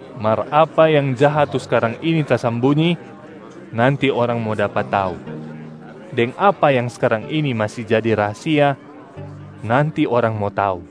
Mar apa yang jaha tu skarang ini tasambunyi, nanti orang mo dapa tau, deng apa yang skarang ini masi jadi rahasia, nanti orang mo tau.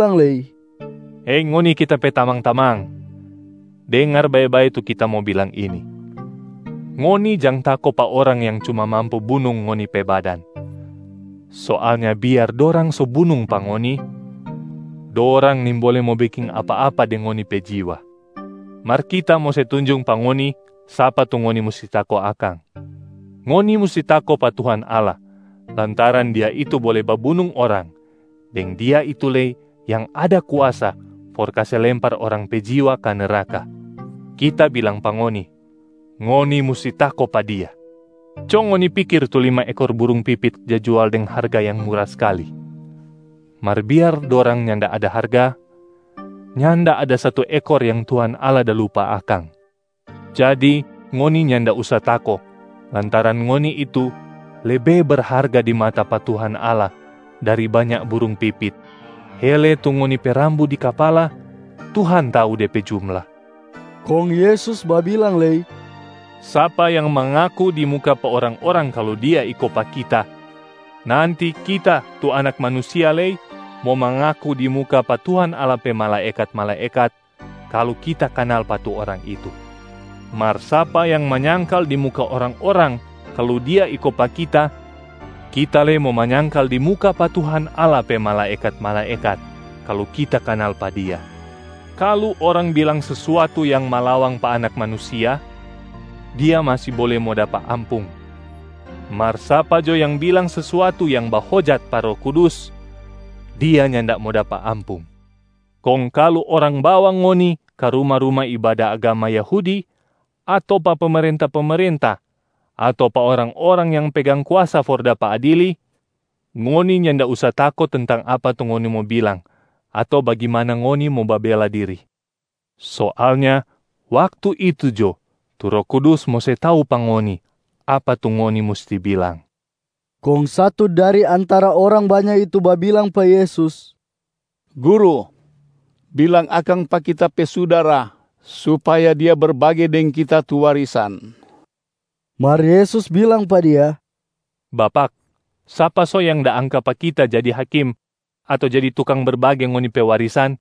Yesus babilang lei, “Hei ngoni Kita pe tamang-tamang, dengar bae-bae tu Kita mo bilang ini: ngoni jang tako pa orang yang cuma mampu bunung ngoni pe badan. Soalnya biar dorang so bunung pa ngoni, dorang nimbole mo beking apa-apa deng ngoni pe jiwa. Mar Kita mo se tunjung pa ngoni sapa tu ngoni musti tako akang. Ngoni musti tako pa Tuhan Allah lantaran Dia itu bole babunung orang deng Dia itu lei yang ada kuasa for kase lempar orang pe jiwa ka neraka. Kita bilang pa ngoni, ngoni musti tako pa Dia! Co ngoni pikir tu lima ekor burung pipit ja jual deng harga yang mura skali. Mar biar dorang nyanda ada harga, nyanda ada satu ekor yang Tuhan Allah da lupa akang. Jadi ngoni nyanda usa tako lantaran ngoni itu lebe berharga di mata pa Tuhan Allah dari banya burung pipit. Hele tu ngoni pe rambu di kapala Tuhan tau de pe jumla.” Kong Yesus babilang lei, “Sapa yang mangaku di muka pa orang-orang kalu dia iko pa Kita, nanti Kita tu Anak Manusia lei mo mangaku di muka pa Tuhan Allah pe malaekat-malaekat kalu Kita kanal pa tu orang itu. Mar sapa yang manyangkal di muka orang-orang kalu dia iko pa Kita, Kita lei mo manyangkal di muka pa Tuhan Allah pe malaekat-malaekat kalu Kita kanal pa dia. Kalu orang bilang sesuatu yang malawang pa Anak Manusia, dia masi bole mo dapa ampung, mar sapa jo yang bilang sesuatu yang bahojat pa Roh Kudus, dia nyanda mo dapa ampung. Kong kalu orang bawa ngoni ka ruma-ruma ibada agama Yahudi ato pa pemerenta-pemerenta ato pa orang-orang yang pegang kuasa for dapa adili, ngoni nyanda usa tako tentang apa tu ngoni mo bilang ato bagimana ngoni mo babela diri. Soalnya waktu itu jo tu Roh Kudus mo se tau pa ngoni apa tu ngoni musti bilang.” Kong satu dari antara orang banya itu babilang pa Yesus, “Guru, bilang akang pa kita pe sudara supaya dia berbage deng kita tu warisan.” Mar Yesus bilang pa dia, “Bapak, sapa so yang da angka pa Kita jadi hakim ato jadi tukang berbage ngoni pe warisan?”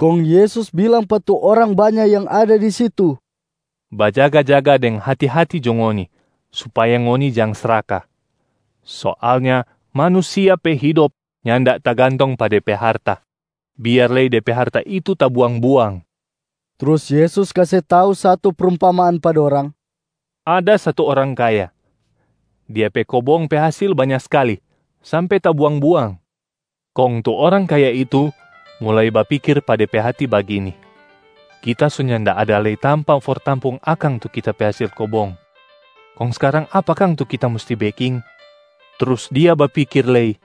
Kong Yesus bilang pa tu orang banya yang ada di situ, “Bajaga-jaga deng hati-hati jo ngoni supaya ngoni jang sraka. Soalnya manusia pe hidop nyanda tagantong pa de pe harta, biar lei de pe harta itu tabuang-buang.” Trus Yesus kase tau satu prumpamaan pa dorang, “Ada satu orang kaya. Dia pe kobong pe hasil banya skali sampe tabuang-buang. Kong tu orang kaya itu mulai bapikir pa de pe hati bagini, ‘Kita so nyanda ada lei tampa for tampung akang tu kita pe hasil kobong, kong skarang apa kang tu kita musti beking?’ Trus dia bapikir lei,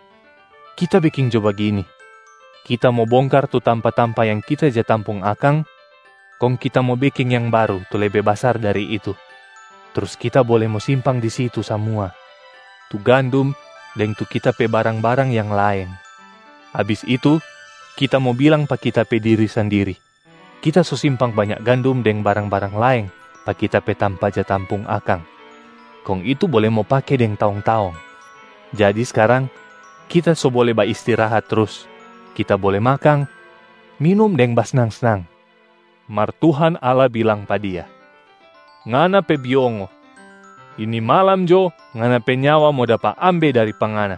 ‘Kita beking jo bagini: kita mo bongkar tu tampa-tampa yang kita ja tampung akang, kong kita mo beking yang baru tu lebe basar dari itu. Trus kita bole mo simpang di situ samua tu gandum deng tu kita pe barang-barang yang laeng. Abis itu kita mo bilang pa kita pe diri sandiri: kita so simpang banya gandum deng barang-barang laeng pa kita pe tampa ja tampung akang, kong itu bole mo pake deng taong-taong. Jadi skarang kita so bole baistirahat trus, kita bole makang, minum deng basnang-snang.’ Mar Tuhan Allah bilang pa dia, ‘Ngana pe biongo! Ini malam jo ngana pe nyawa mo dapa ambe dari pa ngana.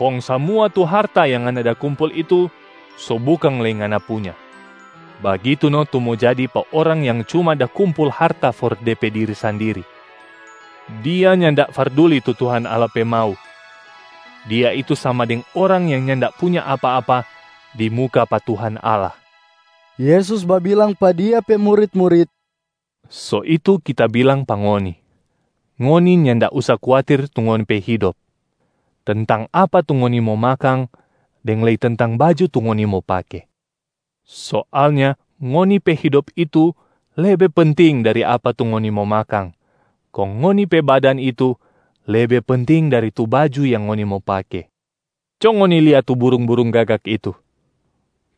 Kong samua tu harta yang ngana da kumpul itu so bukang lei ngana punya.’ Bagitu no tu mo jadi pa orang yang cuma da kumpul harta for de pe diri sandiri. Dia nyanda farduli tu Tuhan Allah pe mau, dia itu sama deng orang yang nyanda punya apa-apa di muka pa Tuhan Allah.” Yesus babilang pa Dia pe murit-murit, “So itu Kita bilang pa ngoni, ngoni nyanda usa kuatir tu ngoni pe hidop, tentang apa tu ngoni mo makang deng lei tentang baju tu ngoni mo pake. Soalnya ngoni pe hidop itu lebe penting dari apa tu ngoni mo makang, kong ngoni pe badan itu lebe penting dari tu baju yang ngoni mo pake. Co ngoni lia tu burung-burung gagak itu.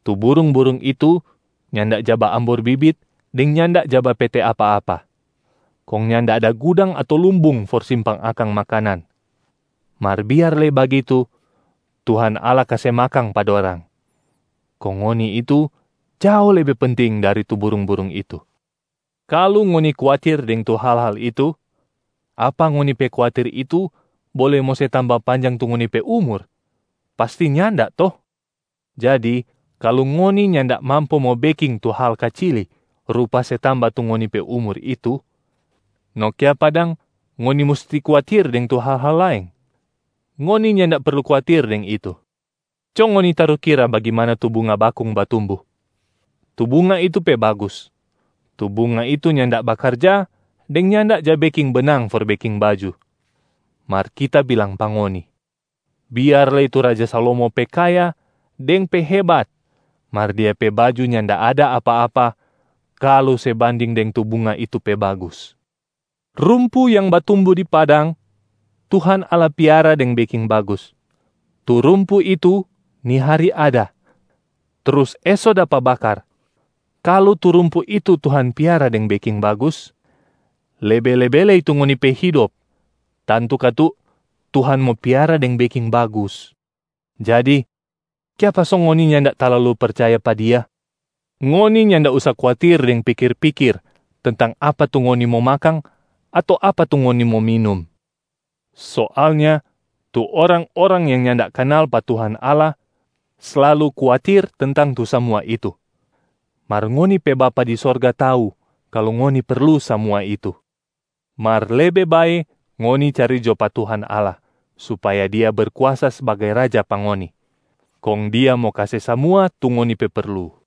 Tu burung-burung itu nyanda ja baambor bibit deng nyanda ja bapete apa-apa, kong nyanda ada gudang ato lumbung for simpang akang makanan. Mar biar lei bagitu Tuhan Allah kase makang pa dorang. Kong ngoni itu jao lebe penting dari tu burung-burung itu. Kalu ngoni kuatir deng tu hal-hal itu, apa ngoni pe kuatir itu bole mo se tamba panjang tu ngoni pe umur? Pasti nyanda to? Jadi kalu ngoni nyanda mampu mo beking tu hal kacili rupa se tamba tu ngoni pe umur itu, no kiapa dang ngoni musti kuatir deng tu hal-hal laeng? Ngoni nyanda perlu kuatir deng itu. Co ngoni tarukira bagimana tu bunga bakung batumbu. Tu bunga itu pe bagus, tu bunga itu nyanda bakarja deng nyanda ja beking benang for beking baju. Mar Kita bilang pa ngoni, biar lei tu raja Salomo pe kaya deng pe hebat mar dia pe baju nyanda ada apa-apa kalu se banding deng tu bunga itu pe bagus. Rumpu yang batumbu di padang, Tuhan Allah piara deng beking bagus. Tu rumpu itu ni hari ada, trus eso dapa bakar. Kalu tu rumpu itu Tuhan piara deng beking bagus, lebe-lebe lei tu ngoni pe hidop tantu katu Tuhan mo piara deng beking bagus. Jadi kiapa so ngoni nyanda talalu percaya pa Dia? Ngoni nyanda usa kuatir deng pikir-pikir tentang apa tu ngoni mo makang ato apa tu ngoni mo minum. Soalnya tu orang-orang yang nyanda kanal pa Tuhan Allah slalu kuatir tentang tu samua itu, mar ngoni pe Bapa di Sorga tau kalu ngoni perlu samua itu. Mar lebe bae ngoni cari jo pa Tuhan Allah supaya Dia Berkuasa sbagai Raja pa ngoni, kong Dia mo kase samua tu ngoni pe perlu.”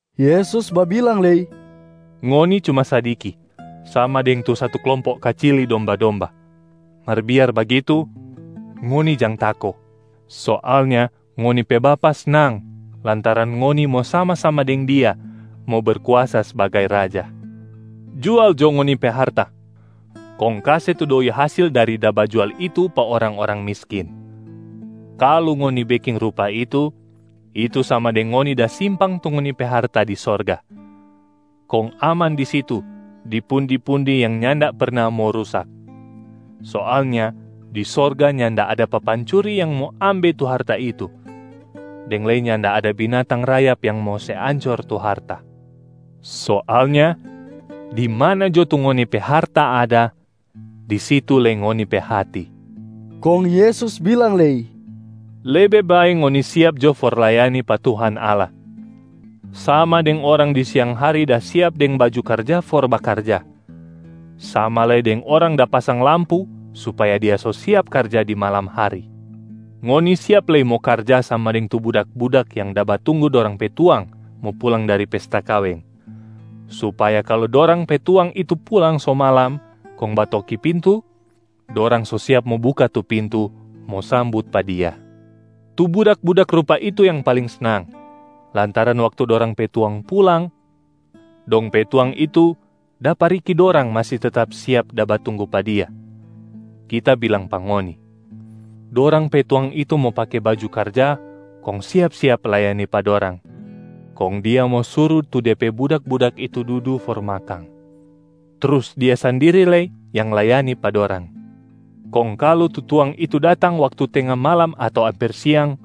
Yesus babilang lei, “Ngoni cuma sadiki, sama deng satu klompo kacili domba-domba. Mar biar bagitu, ngoni jang tako! Soalnya ngoni pe Bapa snang lantaran ngoni mo sama-sama deng Dia mo Berkuasa sbagai Raja. Jual jo ngoni pe harta kong kase tu doi hasil dari da bajual itu pa orang-orang miskin. Kalu ngoni beking rupa itu, itu sama deng ngoni da simpang tu ngoni pe harta di sorga, kong aman di situ di pundi-pundi yang nyanda perna mo rusak. Soalnya di sorga nyanda ada papancuri yang mo ambe tu harta itu, deng lei nyanda ada binatang rayap yang mo se ancor tu harta. Soalnya di mana jo tu ngoni pe harta ada, di situ lei ngoni pe hati.” Kong Yesus bilang lei, “Lebe bae ngoni siap jo for layani pa Tuhan Allah, sama deng orang di siang hari da siap deng baju karja for bakarja, sama lei deng orang da pasang lampu supaya dia so siap karja di malam hari. Ngoni siap lei mo karja sama deng tu budak-budak yang da batunggu dorang pe tuang mo pulang dari pesta kaweng, supaya kalu dorang pe tuang itu pulang so malam kong batoki pintu, dorang so siap mo buka tu pintu mo sambut pa dia. Tu budak-budak rupa itu yang paling snang lantaran waktu dorang pe tuang pulang, dong pe tuang itu dapa riki dorang masi tetap siap da batunggu pa dia. Kita bilang pa ngoni: dorang pe tuang itu mo pake baju karja kong siap-siap layani pa dorang. Kong dia mo suru tu de pe budak-budak itu dudu for makang, trus dia sandiri lei yang layani pa dorang. Kong kalu tu tuang itu datang waktu tenga malam ato amper siang,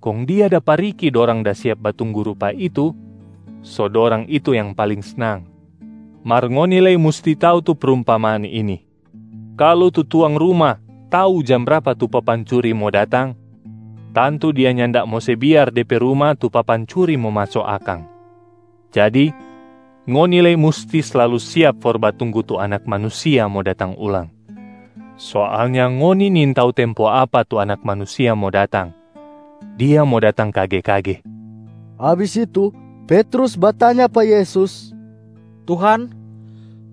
kong dia dapa riki dorang da siap batunggu rupa itu, so dorang itu yang paling snang. Mar ngoni lei musti tau tu prumpamaan ini: kalu tu tuang ruma tau jam brapa tu papancuri mo datang, tantu dia nyanda mo se biar de pe ruma tu papancuri mo maso akang. Jadi, ngoni lei musti slalu siap for batunggu tu Anak Manusia mo datang ulang. Soalnya ngoni nintau tempo apa tu Anak Manusia mo datang, Dia mo datang kage-kage.” Abis itu Petrus batanya pa Yesus, “Tuhan,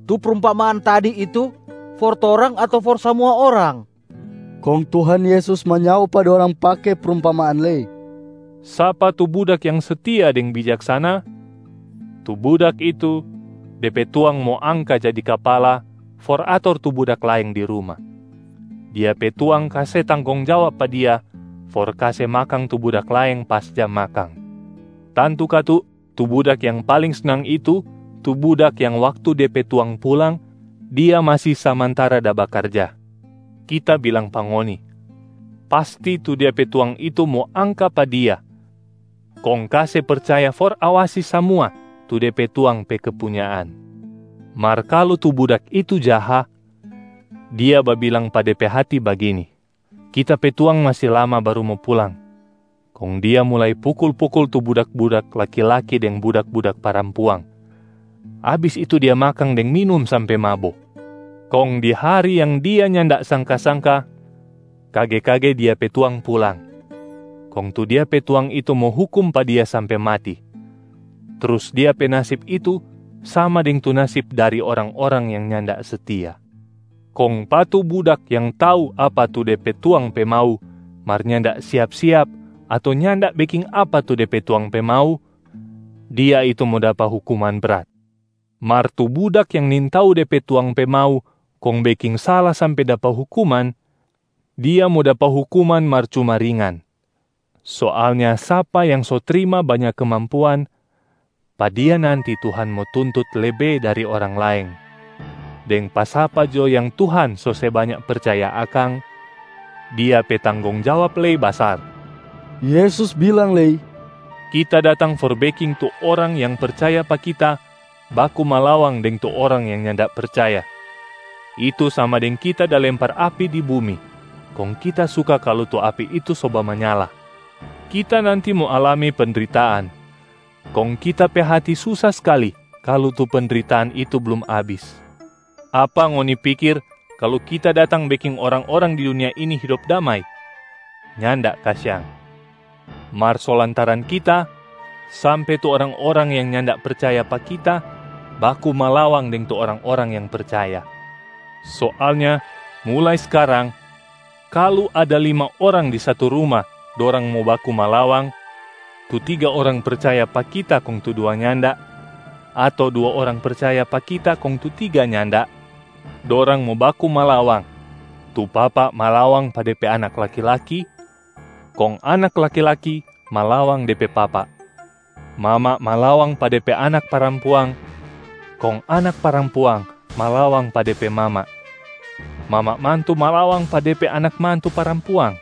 tu prumpamaan tadi itu for torang ato for samua orang?” Kong Tuhan Yesus manyao pa dorang pake prumpamaan lei, “Sapa tu budak yang setia deng bijaksana? Tu budak itu de pe tuang mo angka jadi kapala for ator tu budak laeng di ruma. Dia pe tuang kase tanggong jawab pa dia for kase makang tu budak laeng pas jam makang. Tantu katu tu budak yang paling snang itu tu budak yang waktu de pe tuang pulang dia masi samantara da bakarja. Kita bilang pa ngoni, pasti tu dia pe tuang itu mo angka pa dia kong kase percaya for awasi samua tu de pe tuang pe kepunyaan. Mar kalu tu budak itu jaha, dia babilang pa de pe hati bagini, ‘Kita pe tuang masi lama baru mo pulang.’ Kong dia mulai pukul-pukul tu budak-budak laki-laki deng budak-budak parampuang. Abis itu dia makang deng minum sampe mabo. Kong di hari yang dia nyanda sangka-sangka, kage-kage dia pe tuang pulang, kong tu dia pe tuang itu mo hukum pa dia sampe mati, trus dia pe nasib itu sama deng tu nasib dari orang-orang yang nyanda setia. Kong pa tu budak yang tau apa tu de pe tuang pe mau mar nyanda siap-siap ato nyanda beking apa tu de pe tuang pe mau, dia itu mo dapa hukuman brat. Mar tu budak yang nintau de pe tuang pe mau kong beking sala sampe dapa hukuman, dia mo dapa hukuman mar cuma ringan. Soalnya sapa yang so trima banya kemampuan, pa dia nanti Tuhan mo tuntut lebe dari orang laeng. Deng pa sapa jo yang Tuhan so se banya percaya akang, dia pe tanggong jawab lei basar.” Yesus bilang lei, “Kita datang for beking tu orang yang percaya pa Kita baku malawang deng tu orang yang nyanda percaya, itu sama deng Kita da lempar api di bumi, kong Kita suka kalu tu api itu so bamanyala. Kita nanti mo alami pendritaan, kong Kita pe hati susa skali kalu tu pendritaan itu blum abis. Apa ngoni pikir kalu Kita datang beking orang-orang di dunia ini hidop damai? Nyanda kasiang. Mar so lantaran Kita sampe tu orang-orang yang nyanda percaya pa Kita baku malawang deng tu orang-orang yang percaya. Soalnya mulai skarang, kalu ada lima orang di satu ruma dorang mo baku malawang. Tu tiga orang percaya pa Kita kong tu dua nyanda, ato dua orang percaya pa Kita kong tu tiga nyanda. Dorang mo baku malawang, tu papa malawang pa de pe anak laki-laki, kong anak laki-laki malawang de pe papa. Mama malawang pa de pe anak parampuang, kong anak parampuang malawang pa de pe mama. Mama mantu malawang pa de pe anak mantu parampuang,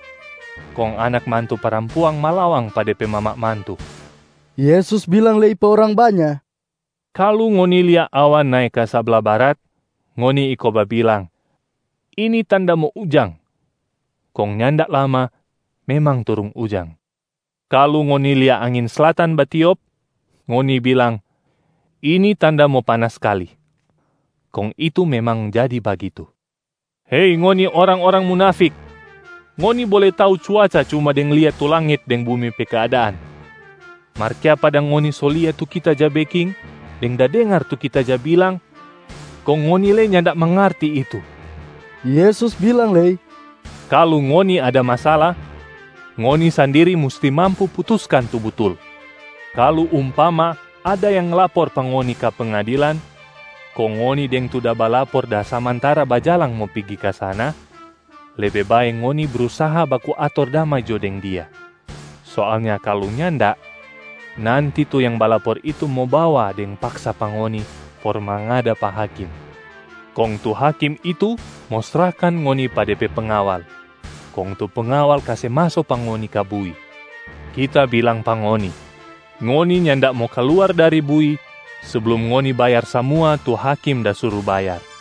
kong anak mantu parampuang malawang pa de pe mama mantu.” Yesus bilang lei pa orang banya, “Kalu ngoni lia awan nae ka sabla barat, ngoni iko babilang, ‘Ini tanda mo ujang,’ kong nyanda lama memang turung ujang. Kalu ngoni lia angin slatan batiop, ngoni bilang, ‘Ini tanda mo panas skali,’ kong itu memang jadi bagitu. Hei ngoni orang-orang munafik! Ngoni bole tau cuaca cuma deng lia tu langit deng bumi pe keadaan. Mar kiapa dang ngoni so lia tu Kita ja beking deng da dengar tu Kita ja bilang, kong ngoni lei nyanda mangarti itu.” Yesus bilang lei, “Kalu ngoni ada masala, ngoni sandiri musti mampu putuskan tu butul. Kalu umpama ada yang lapor pa ngoni ka pengadilan, kong ngoni deng tu da balapor da samantara bajalang mo pigi ka sana, lebe bae ngoni brusaha baku ator damai jo deng dia. Soalnya kalu nyanda, nanti tu yang balapor itu mo bawa deng paksa pa ngoni for mangada pa hakim. Kong tu hakim itu mo srahkan ngoni pa de pe pengawal, kong tu pengawal kase maso pa ngoni ka bui. Kita bilang pa ngoni, ngoni nyanda mo kaluar dari bui seblum ngoni bayar samua tu hakim da suru bayar.”